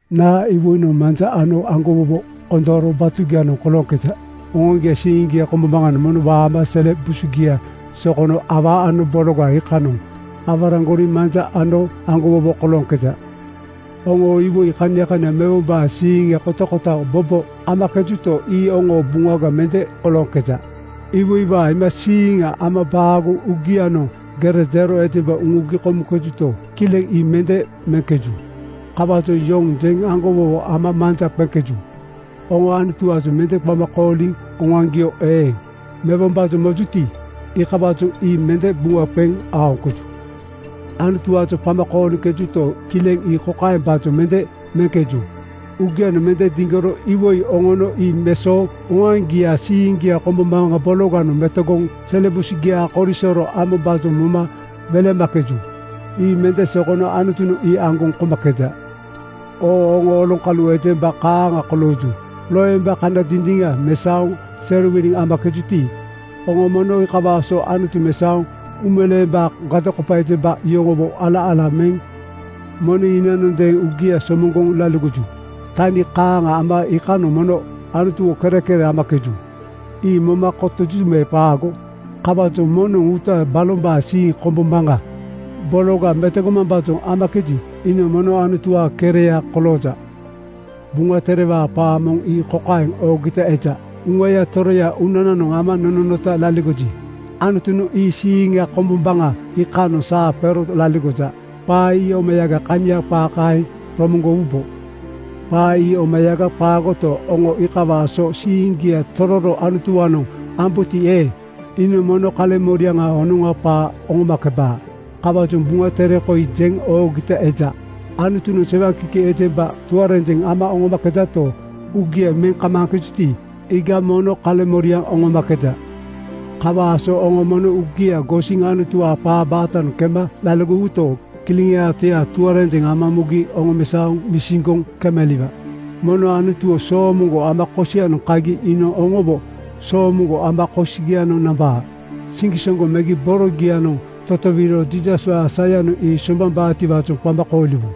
Naa iwoinoŋ manja ano aŋgowowo kondooro batugianoŋ kolooŋkeja? Oŋoaŋgiaa siiŋgia kombombaŋanoŋ mono waama sele busugia sokono awaa ano bologa iikanoŋ aworaŋgori manja ano aŋgowowo kolooŋkeja. Oŋo iwoi kania kania mewombaa siiŋa kotakota bobo momakejuto, ii oŋoo buŋa mende kolooŋkeja. Iwoiwaa iimasiiŋ ama baagoŋ uugianoŋ gere jero ejemba uŋugi komuŋkejuto, kileŋ ii mende meŋkeju. Kawaajoŋ yoŋ jeŋ aŋgo-wowo ama manja qeŋkeju. Oŋo Anutuwaajoŋ mende qama kooliŋ oŋoaŋgio eeŋ mewombaajoŋ mojuti, iikawaajoŋ ii mende buŋa qeŋ aoŋkeju. Anutuwaajoŋ qama kooliŋkejuto, kileŋ ii kokaembaajoŋ mende meŋkeju: Uugianoŋ mende diŋgoro iwoi oŋono ii mesooŋ oŋoaŋgiaa siiŋgia kombombaŋa bologa metogoŋ sele busugiaa korisoro ambombaajoŋ moma welemakeju. Ii mende sokono Anutunoŋ ii aŋgoŋ komakeja. Oo oŋo oloŋkalu ejemba kaaŋa kolooju. Loemba kana dindiŋa mesaoŋ serowiliŋ amakejuti, oŋo mono iikawaa so Anutu mesaoŋ uumeleembaa gadokopa ejemba yoŋowo ala-ala meŋ moneŋ hinanondeeŋ uugia somoŋgoŋ laligoju. Tani kaaŋ ama iikanoŋ mono Anutuwo kerekere amakeju. Ii moma kotoju me qaago? Kawaajoŋ moŋnoŋ uuta balombaa siiŋ kombombaŋa bologa metogomambaajoŋ amakeji, iinoŋ mono Anutuwaa kereya kolooja. Buŋa Terewaa qaa moŋ ii kokaeŋ oogita eja, “Uŋaya Toroya uunananoŋ ama nononota laligoji, Anutunoŋ ii siiŋa kombombaŋa iikanoŋ saa qero laligoja.” Qaa ii omayaga kania qaa kaeŋ romoŋgowubo. Qaa ii omayaga qaagoto, oŋo iikawaa so siiŋgia tororo Anutuwaanoŋ ambuti eeŋ, iinoŋ mono kaleŋmoriaŋa honoŋa qaa oŋomakebaa. Kawaajoŋ Buŋa Tere koi jeŋ oogita eja: “Anutunoŋ sewaŋkiki ejemba tuarenjeŋ ama oŋomakejato, uugia meŋ kamaaŋkejuti, iiga mono kaleŋmoriaŋ oŋomakeja.” Kawaa so oŋo mono uugia gosiŋ Anutuwaa qaa baatanoŋ kema laligowuto, Kileŋaa Toya tuarenjeŋ ama mugi oŋomesaoŋ misiŋgoŋ kemaliwaa. Mono Anutuwo soomoŋgo ama kosianoŋ kagi iinoŋ oŋowo soomoŋgo ama kosogianoŋ nambaa. Siŋgisoŋgo megi borogia-noŋ totowiro Jiisaswaa sayanoŋ ii soŋgbambaatiwaajoŋ qama kooliwu.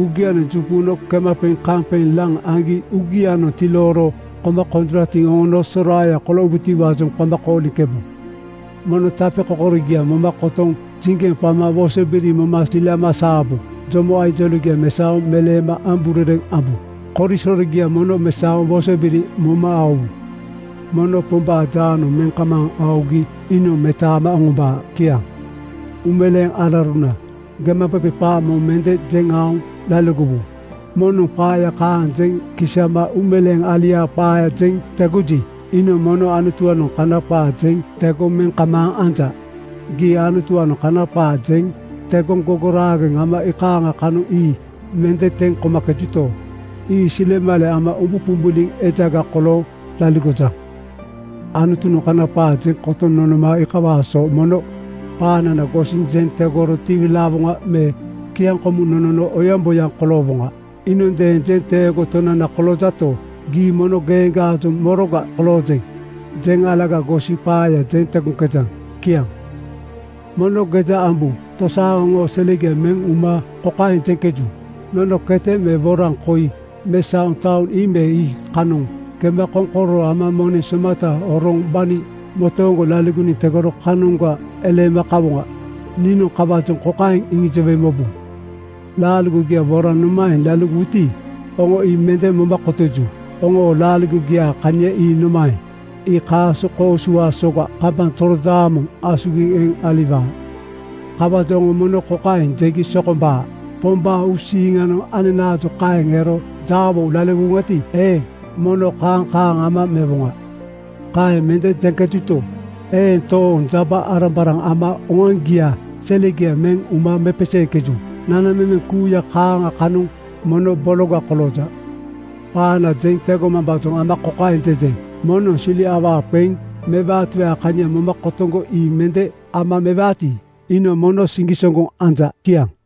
Uugianoŋ juŋquno kemaqeŋ-kaŋqeŋ laŋ aŋgi uugianoŋ tilooro koma konjoratiŋ oŋono soraaya koloowutiwaajoŋ qama kooliŋkebu. Mono tapekokorogia moma kotoŋ jiŋgeŋ qama woso-biri moma silama saabu. Jomo ainjoloŋgia mesaoŋ meleema amburereŋ ambu. Korisorogia mono mesaoŋ wosobiri moma aowu. Mono Pombaa jaanoŋ meŋ kamaaŋ aogi iinoŋ metaama oŋombaa. Kiaŋ. Uumeleeŋ alauruna, gemaqeqe qaa mono mende jeŋ aoŋ laligowu. Moŋnoŋ qaa kaaŋa jeŋ kisama uumeleeŋ aliaa qaaya jeŋ tegoji, iinoŋ mono Anutuwaanoŋ kana qaa jeŋ tegoŋ meŋ kamaaŋ anja. Gii Anutuwaanoŋ kana qaa jeŋ tegoŋ gogoraageŋ ama iikaaŋa kanoŋ ii mende teŋ komakejanto, ii silemale ama umbuqumbuliŋ ejaga kolooŋ laligojaŋ. Anutunoŋ kana qaa jeŋ kotoŋ nonoma iikawaa so mono qaanana gosiŋ jeŋ tegoro tiwilaawoŋa me kiaŋkomuŋ nonono oyaŋboyaŋ koloowoŋa. Iinondeeŋ jenteego Tonana koloojato, gii mono geeŋgaajoŋ “Moroga koloojeŋ?” jeŋ alaga gosiŋ qaaya jeŋ tegoŋkejaŋ? Kiaŋ. Mono geja ambu! Tosaaŋa oŋo selegia meŋ uma kokaeŋ jeŋkeju, “Nono kete me woraŋ koi mesaoŋ taoŋ ii me ii kanoŋ kema koŋkororo ama moneŋ somata horoŋ gbani motooŋgo laligoniŋ tegoro kanoŋga eleema kawoŋa.” Niinoŋ kawaajoŋ kokaeŋ iŋijowe mobu: Laaligogia woraŋ nomaeŋ laligowuti, oŋo ii mende moma kotoju. Oŋoo laaligogiaa kania ii nomaeŋ? Ii kaaso koosuwaa soga kambaŋ torodaamoŋ asugiŋ eŋ aliwaa. Kawaajoŋ oŋo mono kokaeŋ jegi sokombaa, “Pombaa uusiiŋanoŋ ananaajoŋ kaeŋ ero jaawo laligowoŋati eeŋ, mono kaaŋ kaaŋ ama mewoŋa.” Kaeŋ mende jeŋkejuto, eeŋ tooŋ jaba-arambaraŋ ama oŋoaŋgiaa selegia meŋ uma mepeseeŋkeju. Nanamemeŋ kuuya kaaŋa kanoŋ mono bologa kolooja. Qaana jeŋ tegomambaajoŋ ama kokaeŋ jejeŋ: Moŋnoŋ sili awaa qeŋ mewaatiwaa kania moma kotoŋgo ii mende ama mewaati, iinoŋ mono siŋgisoŋgo anja. Kiaŋ.